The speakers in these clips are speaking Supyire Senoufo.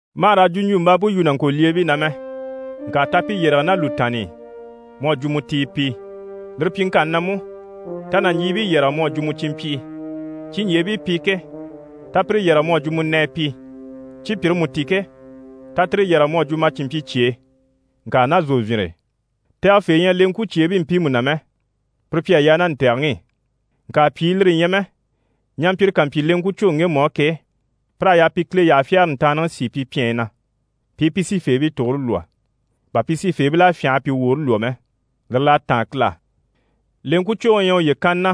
Ma hà raa jwuɲjwumbaama yu nàŋkolyeebii na mɛ, ŋka ta pi yɛrɛge ná lùtaanni i mu à jwo mu tii pi. Lire pyiŋkanni na mú, ta nàɲjiibii yɛrɛge mu à jwo mu cìnmpyii. Ciɲjyeebii pi ke, ta pire yɛrɛge mu à jwo mu nɛɛ pi. Cipyire mú ti ke, ta tire yɛrɛge mu à jwo ma cìnmpyicyee, ŋka ná zòvyinre e. Tɛgɛfee ɲyɛ leŋkwucyeebii mpiimu na mɛ, pire pi à yaa ná ntɛ̀gɛŋi i. Ŋka pyìi, lire ɲyɛ mɛ ɲampyire ká mpyi leŋkwucwoŋi ŋgemu á ke, pir'à yaa pi Kile yyaha fyagare ntaanniŋi sìi pi pyɛnyi na, pi i pi sifeebii tugure lwɔ́, bà pi sifeebil'à fyânha a pi woore lwɔ́ mɛ. Lire l'à táan Kile á. Leŋkwucwoŋi u ɲyɛ uye kanni na,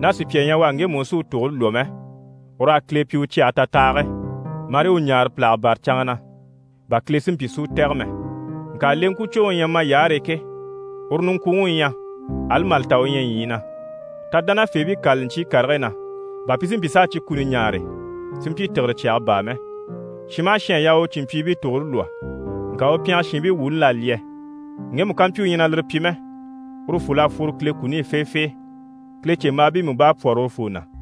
ná sùpya ɲyɛ u á, ŋgemu u sí u tugure lwɔ́ mɛ, ur'à Kile pyi u cyɛge tatahage, marii u ɲáare pìlaga bâra canŋa na, bà Kile si mpyi si u tɛ̀gɛ mɛ. Ŋka leŋkwucwoŋi u ɲyɛ mayaare e ke, uru niŋkwuŋi u ɲyɛ, ali mà li ta u ɲyɛ ɲyii na. Ta dánafeebii kâlali ɲcyii karigii na, bà pi si mpyi s'a cyi kuni ɲaare, si mpyi tìgire cyaga baa mɛ. Shin maha shin à yaa u u cìnmpyiibii tugure lwɔ́, ŋka u pyɛngɛ shiinbii wuuni l'à lyɛ. Ŋgemu ká mpyi u ɲyɛ a lire pyi mɛ, urufol'à fworo Kile kuni i feefee. Kilecembaabii mú bá à pwɔ́rɔ urufoo na.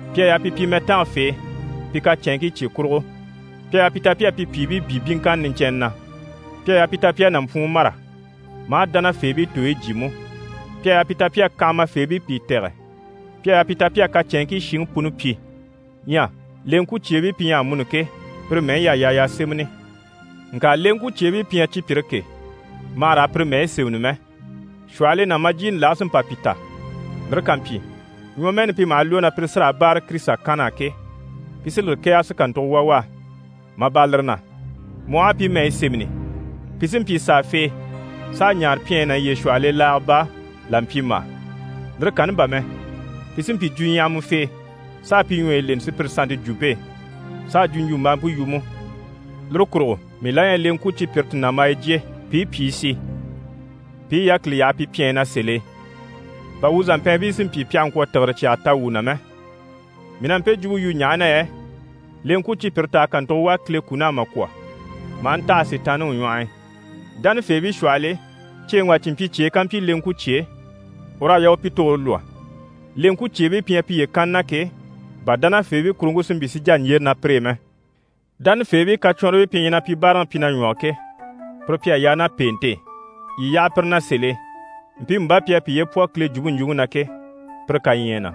Pi à yaa pi pyi mɛtangafee pi kacɛnŋkii cye kurugo, pi à yaa pi ta pi à pi pyìibii byé byíŋkanna niɲcɛnnɛ na, pi à yaa pi ta pi à nàmpwuun mâra, maa dánafeebii tooyi jyé mú, pi à yaa pi ta pi à kanhamafeebii pìi tɛ̀gɛ, pi à yaa pi ta pi à kacɛnŋkii shiŋi puni pyi. Ɲyɛ leŋkwucyeebii pi ɲyɛ amuni ke, pire mɛyi y'à yaa y'a sémɛni. Ŋka leŋkwucyeebii pi ɲyɛ cipyire ke, ma hà raa pire mɛyi sémɛni mɛ. Shwɔhɔl'e nàmbajyiini lage sí n‑pa pi ta. Lire ká mpyi, ɲwɔmɛɛni pi maha lwɔ́, na pire sí raa báare Kirisita kann'á ke, pi sí lire kɛ̀ɛge si kàntugo wà u á. Mà bâra lire na, mu aha a pi mɛyi sémɛni, pi sí n‑pyi sàafee s'a ɲaare pyɛnyi ná yiye shwɔhɔl'e laaga baa, là mpyimbaa. Lire kanni bà mɛ, pi sí n‑pyi jwuɲyahamafee, s'a pi ɲwɔyi leni sùpyire sannte jwumpe e, s'a jwuɲjwumbaampe yu mú. Lire kurugo mii la ɲyɛ leŋkwucipyire ti nàmbaya jyè, pi i pyìi si, pi i yákili yaha pi pyɛnyi na sèl'e, bà wuu zàmpɛɛnbii si mpyi pi àha ŋkwɔ̀ tìgire cyaga ta wuu na mɛ. Mii na mpe jwumpe yu ɲaha na yɛ leŋkwucipyire tà à kàntugo wà Kile kun'á mà kwɔ̀, maa ntaha Sitaanniŋi ɲwɔh'i. Dánafeebii shwɔhɔl'e, ceeŋi wà cìnmpyicyee ká mpyi leŋkwucyee, ur'à yaa u pi tugure lwɔ́, leŋkwucyeebii pi ɲyɛ piye kanni na ke, bà dánafeebii kuruŋke si mpyi si jà ɲjyére ná pire e mɛ. Dánafeebii kacwɔnribii pi ɲyɛ na pi báaraŋi pyi na ɲwɔge ke, pire pi à yaa ná pèente e, yii yaha pire na sèl'e, mpiimu bá pi à piye pwɔ Kile jwumpe ɲjwuŋi na ke, pire kaɲyɛɛ na.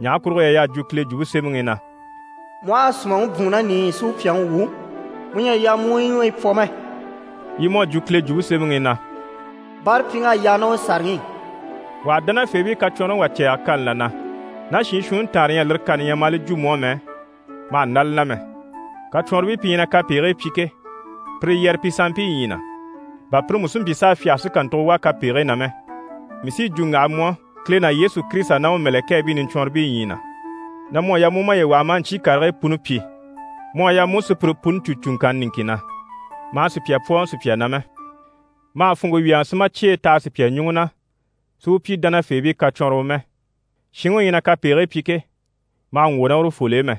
Ɲaha kurugo yɛ y'à jwo Kile Jwumpe Semɛŋi i na: «Mu aha a sùmaŋi bwùun ná nìiyi i si u pyàŋi wwû, mu ɲyɛ a yaa mu u yi ɲwɔyi pwɔ mɛ.» Yi mú à jwo Kile Jwumpe Semɛŋi i na: «Báarapyiŋ'à yaa ná u sàraŋi i.» Wà ha dánafeebii kacwɔnrɔŋi wà cɛ̂ɛge kani là na, ná shiin shuunni taanre ɲyɛ a lire kani ɲya maa li jwo mu á mɛ, ma hà ndá li na mɛ. Kacwɔnribii pi ɲyɛ na kapegigii pyi ke, pire yɛrɛ pi sanmpii ɲyii na, bà pire mú si mpyi s'a fyáge si kàntugo wà kapegigii na mɛ. Mii sí yi jwo n‑waha mu á, Kile ná Yesu Kirisita ná u mɛ̀lɛkɛɛbii niɲcwɔnribii ɲyii na, na mu à yaa mu u maye waha maa ɲcyii karigii puni pyi. Mu à yaa mu u sùpyire puni cû cùŋkanna niŋkin na, ma hà sùpya pwɔ́ɔŋɔ sùpya na mɛ. Ma hà funŋke wyɛ̀ɛŋɛ si ma cyeyi taha sùpya ɲùŋɔ na si u pyi dánafeebii kacwɔnrɔwɔ mɛ. Shinŋi u ɲyɛ na kapegigii pyi ke, ma hà ŋgwɔ̀ ná urufol'e mɛ,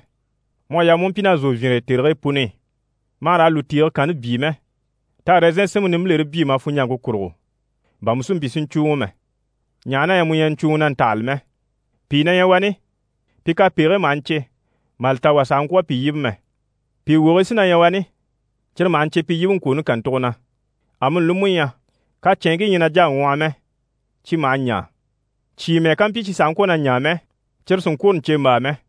mu à yaa mu u pyi ná zòvyinre e tèrigii puni i. Ma hà raa lùtiige kanni byii mɛ, ta ɛrɛzɛn sinmpe nimbilere byii ma funɲjaŋke kurugo, bà mu si mpyi si ɲcùuŋɔ mɛ, ɲaha na yɛ mu ɲyɛ na ɲcùuŋi na ntahali mɛ. Pìi na ɲyɛ wani, pi kapegigii maha ɲcè, mà li ta wà sàha ŋkwɔ̀ a pi yíbe mɛ. Pìi wogii sí na ɲyɛ wani cyire maha ɲcè pi yíbeŋkwooni kàntugo na. Amuni li mú ɲyɛ kacɛnŋkii ɲyɛ na jà a ŋwɔhɔ mɛ, cyi maha ɲaa. Cyìi mɛ́ɛ ká mpyi cyi sàha ŋkwɔ̀ na ɲaa mɛ, cyire sì n‑kwôro ɲcèmbaa mɛ.